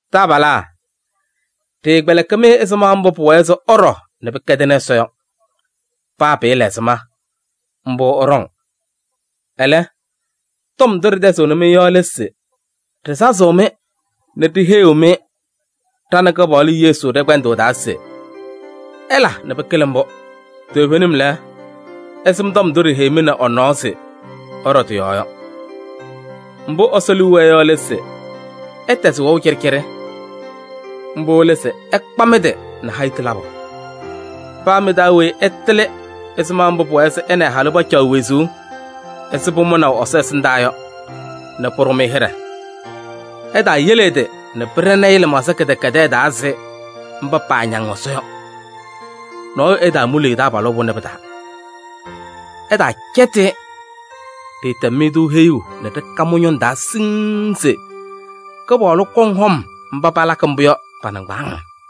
Taabalaa! Ɖɩɩkpɛlɩkɩ-mɩ ɛzɩma mbʋ pʋwɛɛ se ɩɖɔ nɛ pɩkɛdɩnɩ Ɛsɔ yɔ. Paa pɩɩla ɛzɩma, mbʋ ɩɖɔŋ. Ɛlɛ, tɔm ndʋ ɖɩtɛzɩɣnɩ-mɩ yɔ lɛ se ɖɩsazɩɣ-mɩ nɛ ɖiheyiɣ-mɩ ɖa nɛ Kɩpaɣlʋ Yesu ɖɛ-kpɛndʋʋ taa se: ɩla nɛ pɩkɩlɩ mbʋ! Toovenim lɛ, ɩsɩm tɔm ndʋ ɖiheyi-mɩ nɛ ɛ-nɔɔ se ɩɖɔ tɩ-yɔɔ yɔ. Mbʋ Ɛsɔ liu wɛɛ yɔ lɛ se: ɩtɛzɩ wɛʋ cɩɖɩcɩɖɩ. Mbʋ lɛ se ɩkpa mɩ-tɩ nɛ hayitu labʋ. Paa mɩ-taa weyi ɛtɩlɩ ɛzɩma mbʋ pʋwɛɛ se ɛ nɛ ɛ-halʋ pacaɣ wezuu ɛzɩ pʋmʋnaʋ Ɛsɔ ɛsɩndaa yɔ nɛ pʋɖʋ-mɩ hɩɖɛ. Ɛtaayele ɛ-tɩ nɛ pɩɖɛnɩ-ɩ lɩmaɣza kɩdɛkɛdɛɛ taa ɛzɩ mba paañaŋ Ɛsɔ yɔ. Nɔɔyʋ ɛtaamuli ɛ-taabalʋ pʋnɛ pɩ-taa, ɛtaacɛtɩ-ɩ. Ɖɩɩtɛm-mɩ-tʋ heyuu nɛ ɖɩka mɩ-ñʋŋ taa siŋŋ se Kɩpaɣlʋ kɔŋ hɔm mba palakɩ mbʋ yɔ pa-nɩŋgbaaŋ.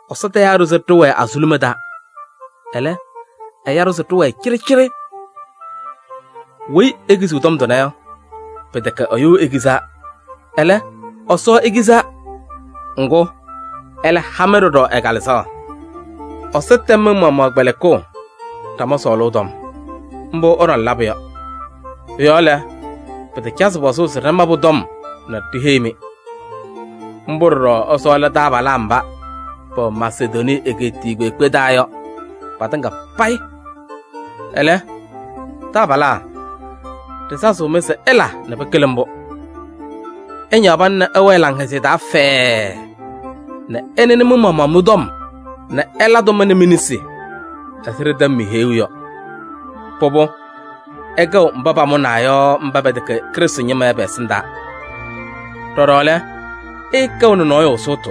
Ɛsɔ tayaa-ɖʋ se ɖɩwɛɛ azuluma taa, ɛlɛ, ɛya-ɖʋ se ɖɩwɛɛ cɩɖɩcɩɖɩ. Weyi ekiziɣ tɔm tʋnɛ yɔ, pɩtɛkɛ ɛyʋ ekizaa. Ɛlɛ, Ɛsɔ ekizaa. Ŋgʋ, ɛlɛ ha-mɩ ɖɔɖɔ ɛ-Kalɩzaɣ. Ɛsɔ tɛm mɩ-maɣmaɣ kpɛlɩkʋʋ ɖama sɔɔlʋʋ tɔm. Mbʋ ɩɖɔŋ labʋ yɔ. Pʋ-yɔɔ lɛ, pɩtacazɩ pɔzʋʋ se ɖɩma pʋ-tɔm nɛ ɖiheyi-mɩ. Mbʋ ɖɔɖɔ ɩsɔɔlɩ taabalaa mba pɛwɛ Masedonii egeetiye kpeekpe taa yɔ patɩŋa payɩ. Ɛlɛ, taabalaa! Ɖɩsazɩɣ-mɩ se ɩla nɛ pɩkɩlɩ mbʋ! Ɩñaɣ pana nɛ ɩwɛɛ laŋhɛzɩyɛ taa fɛɛɛ nɛ ɩnɩnɩ mɩ-maɣmaɣ mɩ-tɔm nɛ ɩla tʋma nɛ mi-nesi ɛzɩ ɖɩtɛm-mɩ heyuu yɔ. Pʋbʋ, ɩkɛɣ mba pamʋnaa yɔ mba pɛtɛkɛ Krɩstʋ ñɩma yɔ pɛ-ɛsɩndaa. Ɖɔɖɔ lɛ, ɩɩkɛɣnɩ nɔɔyʋ sʋʋtʋ.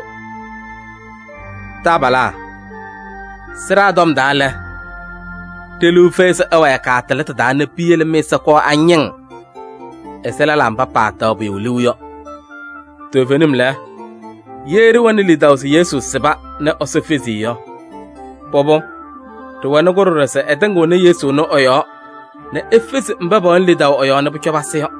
Taabalaa! Sɩɖaa tɔm taa lɛ, ɖe-liu fɛyɩ se ɩwɛɛ kaatɩlɩtʋ taa nɛ piyele mɩ-ɛza kɔɔ añɩŋ ɛzɩ lɛlaa mba paataɣ pʋyʋ liu yɔ. Toovenim lɛ, ye ɖɩwɛnɩ lidaʋ se Yesu sɩba nɛ Ɛsɔ fezi-i yɔ, pʋbʋ, ɖɩwɛnɩ-kʋ ɖɔɖɔ se ɛtɩŋɩɣnɩ Yesu ɛnʋ ɛ-yɔɔ nɛ efezi mba pɛwɛnɩ lidaʋ ɛ-yɔɔ nɛ pʋcɔ pasɩ yɔ.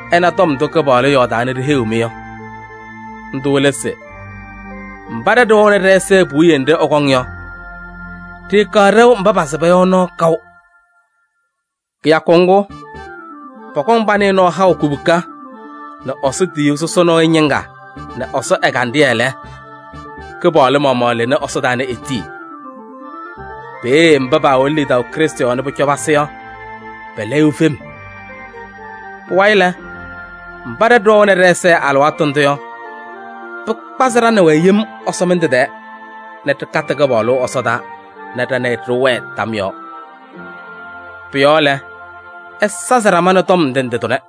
Ɩna tɔm ndʋ Kɩpaɣlʋ yɔɔdaa nɛ ɖiheyiɣ-mɩ yɔ. Ndʋ lɛ se: mba ɖa ɖɩwɛɣnɩ ɖɛ-ɛza puwiye nɖɩ ɛkɔŋ yɔ, ɖɩɩkaɣ ɖɛʋ mba pasɩba yɔ nɔɔ kaʋ. Kɩyakʋ ŋgʋ, pɔkɔŋ panɩɩ nɔɔ haʋ kubuka nɛ Ɛsɔ tiyiyu sɔsɔ nɔɔyʋ ñɩŋga nɛ Ɛsɔ ɛgandɩyɛ lɛ, Kɩpaɣlʋ maɣmaɣ lɩnɩ ɛsɔdaa nɛ etii. Peeye mba paawɛnɩ lidaʋ Krɩstʋ yɔɔ nɛ pʋcɔ pasɩ yɔ, pɛlɛyɩɣ fem. Pʋwayɩ lɛ, mba ɖa ɖɩwɛɣnɩ ɖɛ-ɛza alɩwaatʋ ndʋ yɔ, pɩkpazɩ ɖa nɛ wɛ yem ɛsɔmɩndʋ tɛɛ nɛ ɖɩkatɩ Kɩpaɣlʋ ɛsɔdaa nɛ ɖa nɛ ɩ ɖɩwɛɛ tam yɔɔ. Pʋ-yɔɔ lɛ, ɩsazɩ ɖama nɛ tɔm ndɩ ndɩ tʋnɛ.